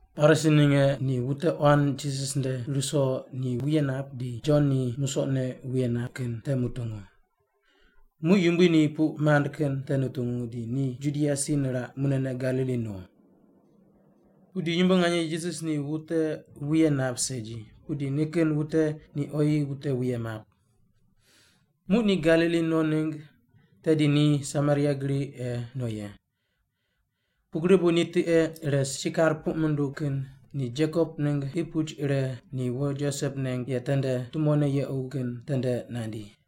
Parisi ninge ni wute quan Jisas nde ruso ni wuye nap di Jon ni musoqne wuye nap kin te mutungu. Muq Yumbui ni puq mand kin te nutungu, di ni Judia si niraq, munene Galili no. Pudi yumbo nganye Jisas ni wute wuye nap segi, pudi nikin wute ni oyi wute wuye map. Muq ni Galili no ningg tedi ni Samaria gri ei no ye. Pugri bu tiqe ire Sikar puq munduw kin ni Jekop ningg qi puch ire ni wo Josep neng ye tende tumone yequ kin tende nandi.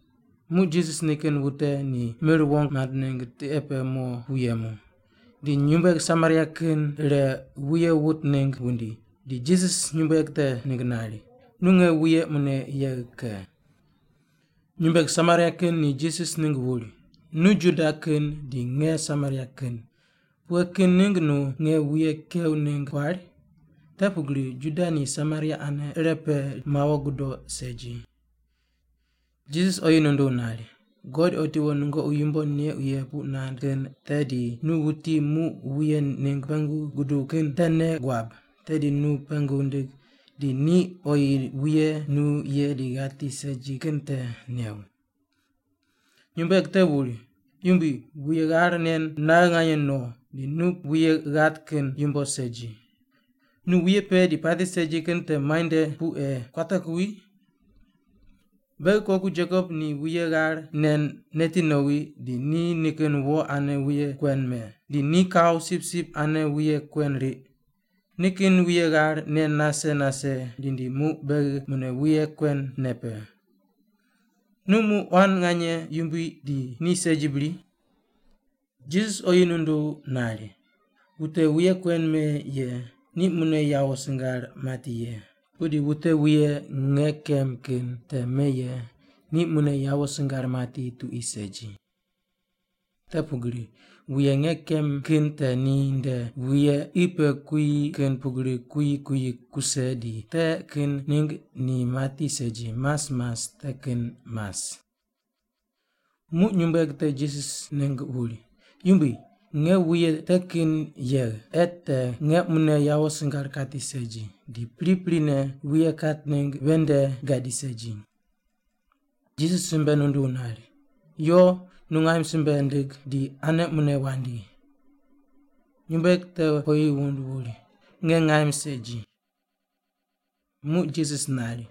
Muq Jisas nikin wute ni mir wong mand ningg tiqe pe mo pu yemu. Di nyumbueg Samaria kin ire wuye wut ningg wundi, di Jisas nyumbueg te ningg nari, “Nu nge wuye mune yegh ke.” Nyumbueg Samaria kin ni Jisas ningg wuri, “Nu Juda kin di nge Samaria kin. Pughe kin ningg nu nge wuye kew ningg kuari?” (Te pugri Juda ni Samaria ane irepe mawo gudo segi.) Jisas oyi nunduw nari, “God otiwo nungoqi yumbo neuq ye puq nand kin te di nu wuti muq wuye ningg pengu guduw kin te nei guab, tedi nu ni pengu ndig di ni oyi wuye nu ye di ghati segi kin te new.” Nyumbueg te wuri, “Yumbui, wuye ghar nen naghe nganye no, di nu wuye ghat kin yumbo segi. Nu wuye pe di pati segi kin te muai nde pu ei kuate kuwi? Beghi koku Jekop ni wuye ghar nen neti nowi, di ni nikin wo ane wuye kuen me. Di ni kau sipsip ane wuye kuen riq. Nikin wuye ghar nen nase nase rindi muq beghi mune wuye kuen ne pe. Nu muq quan nganye yumbui di ni segi bri?” Jisas oyi nunduw nari, “Wute wuye kuen me ye, ni mune yawo singar mati ye, pudi wute wuye nge kem kin te me ye, ni mune yawo singar mati tuqui segi. Te pugri wuye nge kem kin te ni nde wuye qi pe kuyi kin pugri kuyi kuyi kuse di te kin ningg ni mati segi, mas mas te kin mas.” Muq nyumbueg te Jisas ningg wuri, “Yumbui, nge wuye te kin yegh, ei te nge munene yawo singar kati segi, di priprine wuye kat ningg ven nde gadi segi.” Jisas simbe nunduw nari, “Yo, nungaim simbe ndig, di ane mune wandi.” Nyumbueg te oyi wund wuri, “Nge ngaim segi.” Muq Jisas nari,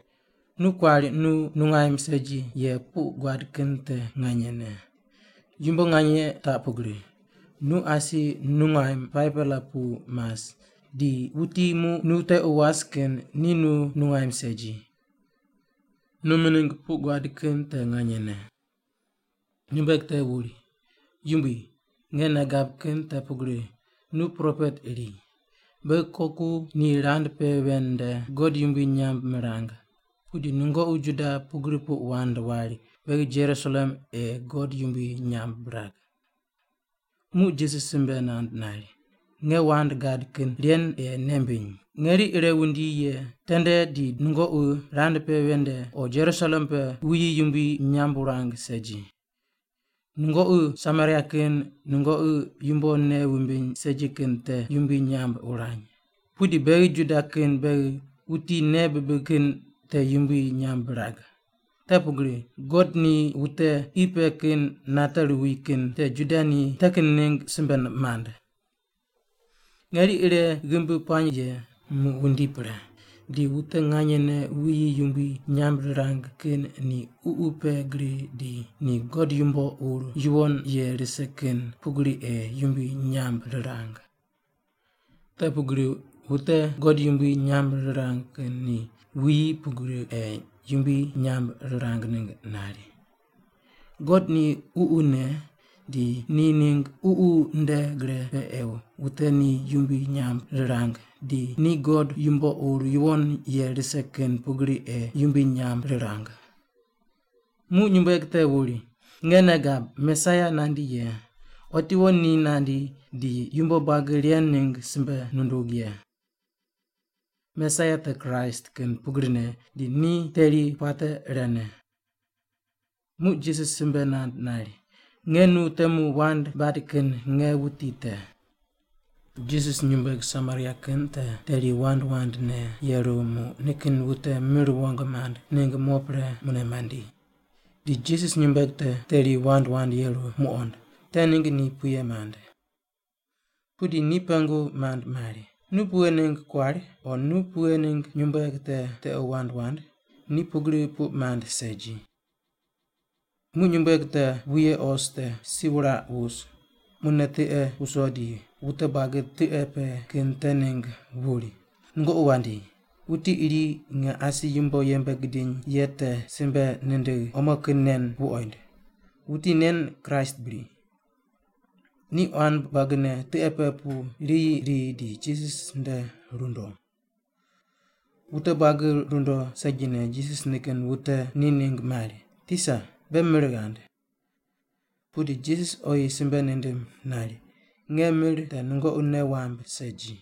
“Nu kuari nu nungaim segi ye puq guad kin te nganyene. Yumbo nganye taq pugri, nu asi nungaim 5-pela pu mas, di wuti muq nu tequ was kin ni nu nungaim segi. Nu mining puq guad kin te nganyene.” Nyumbueg te wuri, “Yumbui, nge nei gab kin te pugri nu propet iri. Beghi koku ni rand pe ven nde God yumbui nyamb mirang, pudi nungoqi Juda pugri puq wand wari beghi Jerusalem ei God yumbui nyamb birag.” Muq Jisas simbe nand nari, “Nge wand gad kin ren ei nei mbiny, ngeri ire wundi ye tende di nungoqi rand pe ven nde o Jerusalem pe wuyi yumbui nyamb wurang segi. Nungoqi Samaria kin nungoqi yumbo nei wumbiny segi kin te yumbui nyamb wurany, pudi beghi Juda kin beghi wuti nei bibig kin te yumbui nyamb birag, te pugri God ni wute qi pe kin nate ruwi kin te Juda ni te kin ningg simbe mand. Ngeri ire ghimbi puany ye, muq wundi pre, di wute nganyene wuyi yumbui nyamb rirang kin ni ququ pe gri di ni God yumbo ur yuwon ye rise kin pugri ei yumbui nyamb rirang. Te pugri wute God yumbui nyamb rirang kin ni wuyi pugri ei yumbui nyamb rirang ningg nari. God ni ququne, di ni ningg ququ nde gre pe ei wute ni yumbui nyamb rirang di ni God yumbo ur yuwon ye rise kin pugri ei yumbui nyamb rirang.” Muq nyumbueg te wuri, “Nge nei gab Mesaia nandi ye. Otiwo ni nandi di yumbo buagi ren ningg simbe nundug ye.” (Mesaia, te Kraist kin pugrine, di ni teri puate irene.) Muq Jisas simbe nand nari, “Nge nu temu wand bad kin nge wuti te.” Jisas nyumbueg Samaria kin te teri wand wandne yeru muq nikin wute mir wong mand ningg mo pre mune mandi, di Jisas nyumbueg te teri wand wand yeru muqond, te ningg ni puye mand. Pudi ni pengu mand mari, “Nu pughe ningg kuari?” o “Nu pughe ningg nyumbueg te tequ wand wand?” ni pugri puq mand segi. Muq nyumbueg te wuye os te si wuraq wus, munene tiqe wuso di wute buagi tiqe pe kin te ningg wuri, “Nungoqi wandi, wuti iri nge asi yumbo yembe gidiny ye te simbe nindigh omo kin nen wuqoind. Wuti nen Kraist bri?” Ni quan buagine tiqe pe pu riyi ri di Jisas nde rundo. Wute buagi rundo segine Jisas nikin wute ni ningg mari, “Tisa, be mir ghand.” Pudi Jisas oyi simbe nindim nari, “Nge mir te nungoqi nei wamb segi.”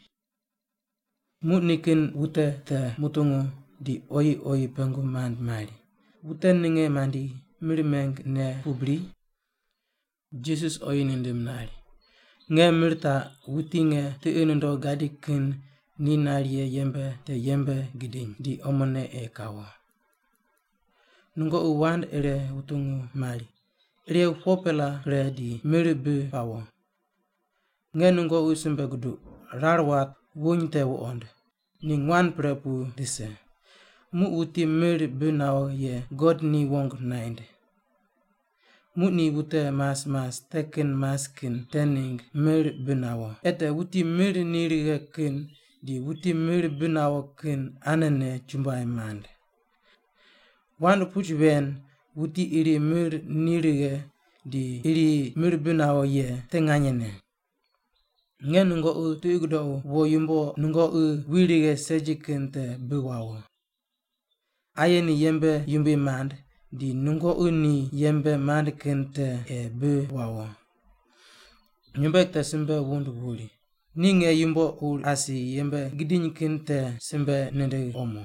Muq nikin wute te mutungu di oyi oyi pengu mand mari, “Wute ninge mandi, mir meng ne pu bri?” Jisas oyi nindim nari, “Nge mir taq wuti nge tiqi nundogh gadi kin ni nari ye yembe te yembe gidiny di omone ei kawo. Nungoqi wand ire wutungu mari, ‘Irew 4-pela pre di mir bi pawo.’ Nge nungoqi simbe guduq, rar wat wuny te wuqond, ni nguan pre pu rise. Muq wuti mir bi nawo ye God ni wong naind. Muq ni wute mas mas te kin mas kin te ningg mir bi nawo, ei te wuti mir ni righe kin di wuti mir bi nawo kin anene chumbuai mand. Wand puch ven, ‘Wuti iri mir ni righe, di iri mir bi nawo’ ye te nganyene. Nge nungoqi tiqi gudoqu wo yumbo nungoqi wi righe segi kin te bi wawo. Aye ni yembe yumbui mand, di nungoqi ni yembe mand kin te ei bi wawo.” Nyumbueg te simbe wund wuri, “Ni nge yumbo ur asi yembe gidiny kin te simbe nindigh omo.”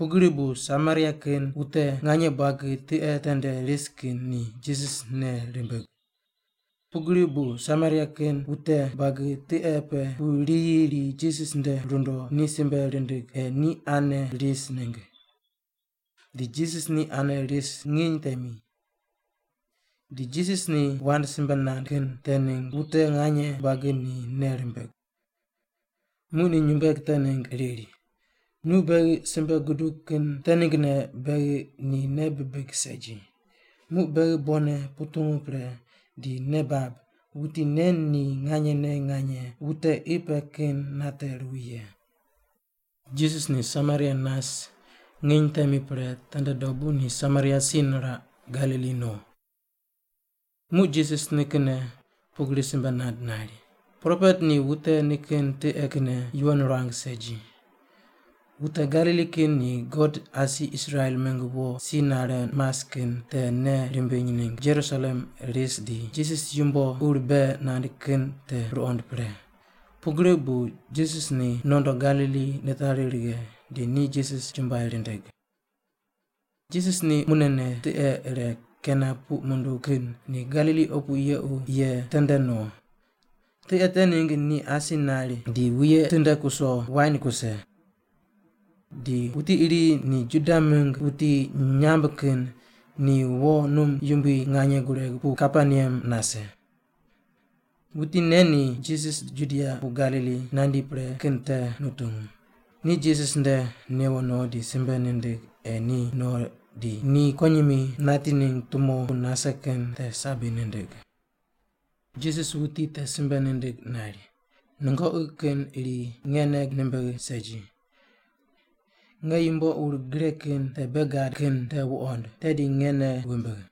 Pugri bu Samaria kin wute nganye buagi tiqe tende ris kin ni Jisas nei rimbig. Pugri bu Samaria kin wute buagi tiqe pe pu riyi ri Jisas nde rundo ni simbe rindig ei ni ane ris ningg. Di Jisas ni ane ris nginy temi. Di Jisas ni wand simbe nand kin te ningg wute nganye buagi ni nei rimbig. Muq ni nyumbueg te ningg riri, “Nu beghi simbe gudug kin te ninggne beghi ni nei bibig segi, muq beghi bonne putungu pre, di nei bab wuti nen ni nganyene nganye wute qi pe kin nate ruwi ye.” Jisas ni Samaria nas nginy temi pre tende dobu ni Samaria si niraq Galili no. Muq Jisas nikinne pugri simbe nand nari, “Propet ni wute nikin tiqe kinne yuwon ruang segi.” Wute Galili kin ni God asi Israel mingg wo si nare mas kin te nei rimbiny ningg Jerusalem ris di Jisas yumbo ur bei nand kin te ruqond pre, pugri bu Jisas ni nondo Galili nitari righe di ni Jisas chumbuai rindig. Jisas ni munene tiqe ire Kana puq munduw kin ni Galili opu yequ ye tende no. Tiqe te ningg ni asi nari di wuye tinde kuso wain kuse. Di wuti iri ni Juda mingg wuti nyamb kin ni wo num yumbui nganye gureg pu Kaperneam nase. Wuti nen ni Jisas Judia pu Galili nandi pre kin te nutungu, ni Jisas nde newo no di simbe nindig ei ni no di ni kuwonyimi nati ningg tumo pu nase kin te sabi nindig. Jisas wuti te simbe nindig nari, “Nungoqi kin iri nge nei nimbigh segi. Nge yumbo ur gre kin te bei gad kin te wuqond, tedi nge nei wumbigh.”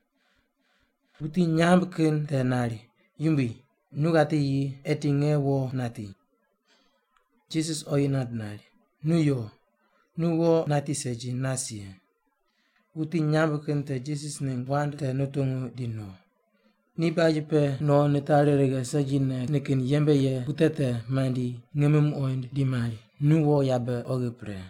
Wuti nyamb kin te nari, “Yumbui, nu ghati yi, eti nge wo nati.” Jisas oyi nand nari, “Nu yo. Nu wo nati segi, nas ye.” Wuti nyamb kin te Jisas ningg wand te nutungu di no. Ni baj pe no nitari righe segine nikin te yembe ye wute te mandi ngimi muqoind di mari, “Nu wo yabe oghi pre.”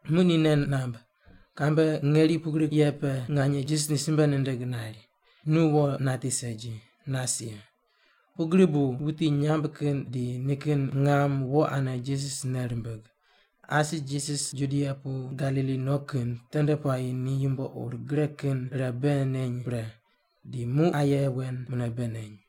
Muq ni nei namb, kambe ngeri pugri ye pe nganye Jisas ni simbe nindig nari, “Nu wo nati segi, nas ye.” Pugri bu wuti nyamb kin di nikin ngam wo ane Jisas nei rimbig. Asi Jisas Judia pu Galili no kin tende puayi ni yumbo ur gre kin ire bei neny pre, di muq aye wen mune bei neny.